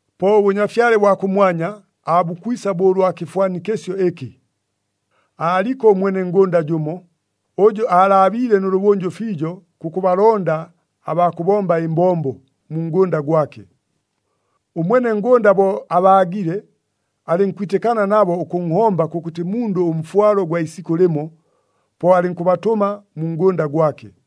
“Po ʉBʉnyafyale bwa kʉmwanya, aabukwisa bo ʉlwa kɨfwanikɨsyo ɨkɨ. Aaliko ʉmwene ngʉnda jʉmo, ʉjʉ aalaabiile nʉlʉbʉnjʉ fiijo kʉkʉbalonda abaa kʉbomba ɨmbombo mu ngʉnda gwake. Ʉmwene ngʉnda bo abaagile, alɨnkwitɨkana nabo ʉkʉnhomba kʉkʉtɨ mundʉ ʉmfwalo gwa isikʉ lɨmo, po alɨnkʉbatʉma mu ngʉnda gwake.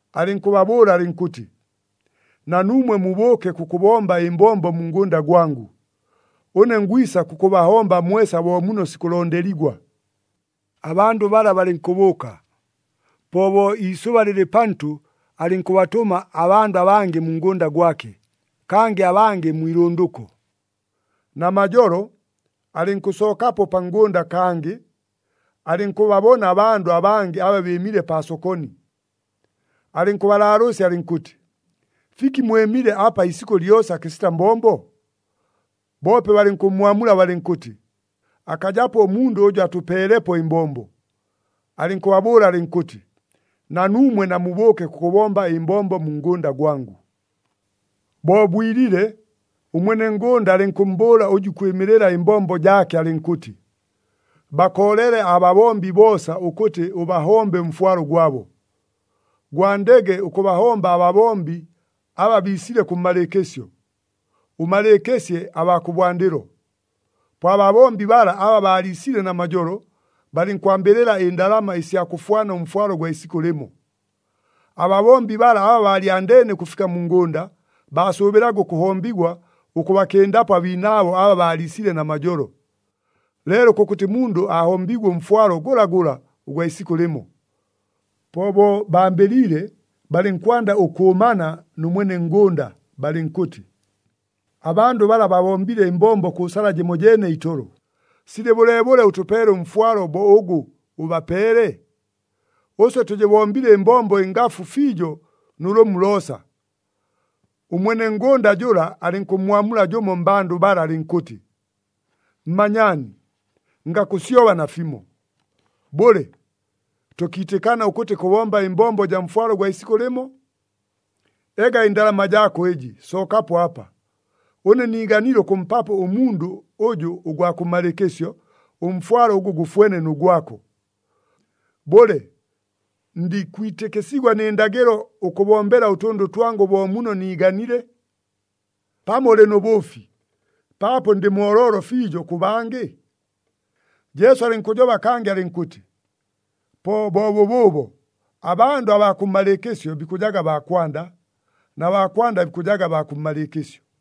Alɨnkʉbabʉʉla alɨnkʉtɨ, ‘Na nuumwe mubʉʉke kʉkʉbomba ɨmbombo mu ngʉnda gwangʉ. Ʉne ngwisa kʉkʉbahomba mwesa bo muno sikʉlondeligwa.’ Abandʉ bala balɨnkʉbʉʉka. Po bo iisʉba lɨlɨ pantʉ alɨnkʉbatʉma abandʉ abangɨ mu ngʉnda gwake, kangɨ abangɨ mwi ilʉndʉko. Namajolo, alɨnkʉsookapo pa ngʉnda kangɨ, alɨnkʉbabona abandʉ abangɨ aba bɨɨmile paa sokoni. Alɨnkʉbalaalʉʉsya alɨnkʉtɨ, ‘Fiki mwɨmile apa iisikʉ lyosa kɨsita mbombo?’ Boope balɨnkʉmmwamula balɨnkʉtɨ, ‘Akajapo ʉmundʉ ʉjʉ atʉpeelepo ɨmbombo.’ Alɨnkʉbabʉʉla alɨnkʉtɨ, ‘Na nuumwe namubʉʉke kʉkʉbomba ɨmbombo mu ngʉnda gwangʉ.’ “Bo bwilile, ʉmwene ngʉnda alɨnkʉmmbʉʉla ʉjʉ ikwɨmɨlɨla ɨmbombo jaake alɨnkʉtɨ, ‘Bakoolele ababombi boosa ʉkʉtɨ ʉbahombe ʉmfwalo gwabo, gwandege ʉkʉbahomba ababombi aba biisile kʉmmalɨɨkɨsyo, ʉmalɨɨkɨsye abaa kʉbwandɨlo.’ Po ababombi bala aba baaliisile namajolo, balɨnkwambɨlɨla ɨndalama ɨsya kʉfwana ʉmfwalo gwa isikʉ lɨmo. Ababombi bala aba baalyandeene ʉkʉfika mu ngʉnda, baasʉʉbɨlaga ʉkʉhombigwa ʉkʉbakɨndapo abiinaabo aba baaliisile namajolo. Leelo kʉkʉtɨ mundʉ aahombiigwe ʉmfwalo gʉlagʉla ʉgwa isikʉ lɨmo. Po bo bambɨliile, balɨnkwanda ʉkʉʉmana nʉ mwene ngʉnda balɨnkʉtɨ, ‘Abandʉ bala babombile ɨmbombo kʉ sala jɨmojeene itolo, silɨ bʉleebʉle ʉtʉpeele ʉmfwalo bo ʉgʉ ʉbapeele? Ʉswe tʉjɨbombile ɨmbombo ɨngafu fiijo nʉ lʉmu loosa.’ Ʉmwene ngʉnda jʉla alɨnkʉmmwamula jʉmo mmbandʉ bala alɨnkʉtɨ, ‘Mmanyaani, ngakʉsyoba nafimo. Bʉle, tʉkiitɨkana ʉkʉtɨ kʉbomba ɨmbombo ɨjaa mfwalo gwa isikʉ lɨmo? Ega ɨndalama jaako ɨjɨ, sookapo apa! Ʉne niiganile ʉkʉmpapo ʉmundʉ ʉjʉ ʉgwa kʉmmalɨɨkɨsyo, ʉmfwalo ʉgʉ gʉfwene nʉ gwako. Bʉle, ndikwitɨkɨsigwa nɨ ndagɨlo ʉkʉbombela ʉtʉndʉ twangʉ bo muno niiganiile? Pamo ʉlɨ nʉ bʉʉfi, paapo ndɨ mooloolo fiijo kʉ bangɨ?’” Jesu alɨnkʉjoba kangɨ alɨnkʉtɨ, “Po bo bʉbʉʉbo, abandʉ abaa kʉmmalɨɨkɨsyo bikʉjaga baa kwanda, na baa kwanda bikʉjaga baa kʉmmalɨɨkɨsyo.”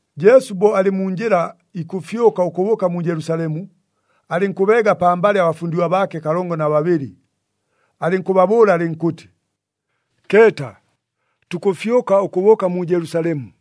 Jesu bo alɨ mu njɨla ikʉfyʉka ʉkʉbʉʉka mu Jelusalemu, alɨnkʉbeega pambalɨ abafundigwa baake kalongo na babɨlɨ, alɨnkʉbabʉʉla alɨnkʉtɨ, “Keeta, tukʉfyʉka ʉkʉbʉʉka mu Jelusalemu.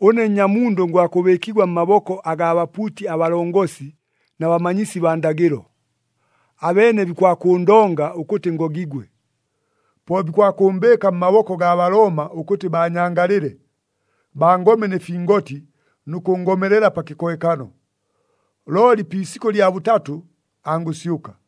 Ʉne Nnyamundʉ ngwakʉbɨɨkigwa mmaboko agaa bapuuti abalongosi na bamanyisi baa ndagɨlo. Abeene bikwakʉʉndonga ʉkʉtɨ ngogigwe. Po bikwakʉʉmbɨɨka mmaboko agaa Balooma ʉkʉtɨ baanyangalɨle, bangome nɨ fingoti nʉ kʉngomelela pa kɨkohekano. Looli pi isikʉ lya bʉtatʉ, angʉsyʉka.”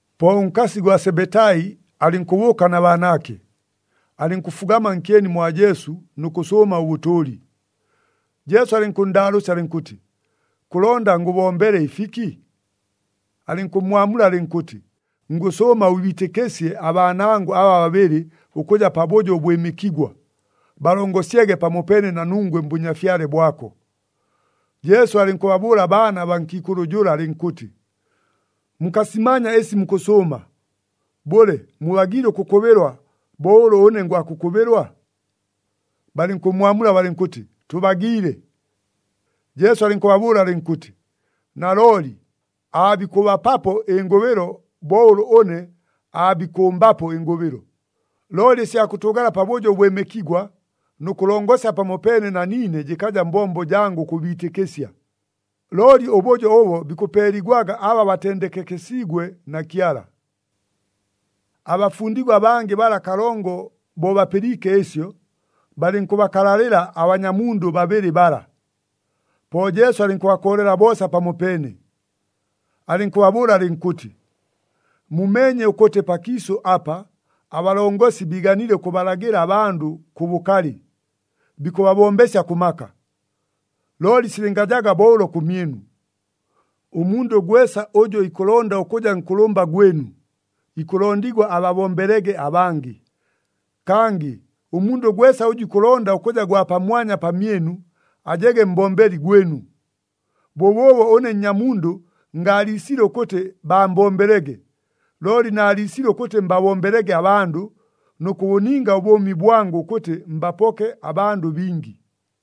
Po ʉnkasi gwa Sebetai alɨnkʉbʉʉka na baanaake, alɨnkʉfugama nkyeni mwa Jesu nʉ kʉsʉʉma ʉbʉtʉʉli. Jesu alɨnkʉnndaalʉʉsya alɨnkʉtɨ, “Kʉlonda ngʉbombele ɨfiki?” Alɨnkʉmmwamula alɨnkʉtɨ, “Ngʉsʉʉma ʉbiitɨkɨsye abaanangʉ aba babɨlɨ ʉkʉja pabʉjo ʉbwɨmɨkigwa, balongosyege pamopeene na nungwe mBʉnyafyale bwako.” Jesu alɨnkʉbabʉʉla abaana baa nkiikʉlʉ jʉla alɨnkʉtɨ, “Mukasimanya ɨsi mukʉsʉʉma. Bʉle, mubagiile ʉkʉkʉbɨlwa bo ʉlʉ ʉne ngwakʉkʉbɨlwa?” Balɨnkʉmmwamula balɨnkʉtɨ, “Tʉbagiile.” Jesu alɨnkʉbabʉʉla alɨnkʉtɨ, “Nalooli aabikʉbapapo ɨngʉbɨlo bo ʉlʉ ʉne aabikʉmbapo ɨngʉbɨlo. Looli ɨsya kʉtʉʉgala pabʉjo ʉbwɨmɨkigwa nʉ kʉlongosya pamopeene na niine jɨkaja mbombo jangʉ ʉkʉbiitɨkɨsya, looli ʉbʉjo ʉbo bikʉpeeligwaga aba batendekekesiigwe na Kyala.” Abafundigwa abangɨ bala kalongo, bo bapɨliike ɨsyo, balɨnkʉbakalalɨla abanyamundʉ babɨlɨ bala. Po Jesu alɨnkʉbakoolela boosa pamopeene, alɨnkʉbabʉʉla alɨnkʉtɨ, “Mumeenye ʉkʉtɨ pakiisʉ apa, abalongosi biiganile ʉkʉbalagɨla abandʉ kʉ bʉkalɨ, bikʉbabombesya kʉ maka. Looli silɨngajaga bo ʉlo kʉmyɨnu. Ʉmundʉ gwesa ʉjʉ ikʉlonda ʉkʉja nkʉlʉmba gwɨnu, ikʉlondigwa ababombelege abangɨ. Kangɨ ʉmundʉ gwesa ʉjʉ ikʉlonda ʉkʉja gwa pamwanya pamyɨnu, ajege mbombeli gwɨnu. Bʉbʉʉbo ʉne Nnyamundʉ ngaaliisile ʉkʉtɨ baambombelege, looli naaliisile ʉkʉtɨ mbabombelege abandʉ, nʉ kʉbʉninga ʉbʉʉmi bwangʉ ʉkʉtɨ mbapoke abandʉ bingi.”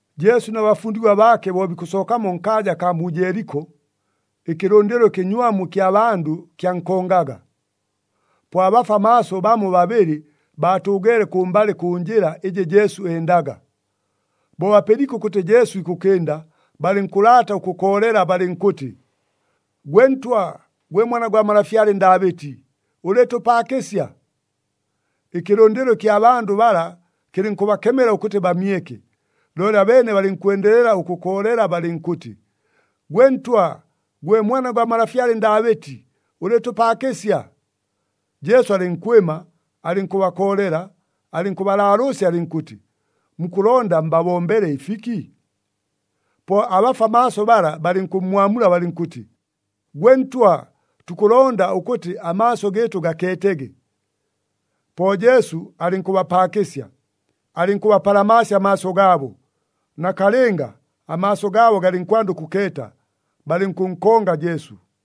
Jesu na bafundigwa baake bo bikʉsookamo nkaaja akaa mu Jeeliko, ɨkɨlʉndɨlo ɨkɨnywamu ɨkya bandʉ kyankongaga. Po abafwa maaso bamo babɨlɨ baatʉʉgeele kʉmbalɨ kʉ njɨla ɨjɨ Jesu endaga. Bo bapɨliike ʉkʉtɨ Jesu ikʉkɨnda, balɨnkʉlaata ʉkʉkoolela balɨnkʉtɨ, “Gwe Ntwa, gwe Mwana gwa malafyale Ndaabɨti, ʉlɨɨtʉpaakɨsya!” Ɨkɨlʉndɨlo ɨkya bandʉ bala kɨlɨnkʉbakemela ʉkʉtɨ bamyeke. Looli abeene balɨnkwendelela ʉkʉkoolela balɨnkʉtɨ, “Gwe Ntwa, gwe Mwana gwa malafyale Ndaabɨti, ʉlɨɨtʉpaakɨsya!” Jesu alɨnkwɨma, alɨnkʉbakoolela, alɨnkʉbalaalʉʉsya alɨnkʉtɨ, “Mukʉlonda mbabombele ɨfiki?” Po abafwa maaso bala balɨnkʉmmwamula balɨnkʉtɨ, “Gwe Ntwa, tukʉlonda ʉkʉtɨ amaaso gɨɨtʉ gakeetege.” Po Jesu alɨnkʉbapaakɨsya, alɨnkʉbapalamaasya amaaso gaabo. Nakalɨnga, amaaso gaabo galɨnkwanda ʉkʉkeeta, balɨnkʉnkonga Jesu.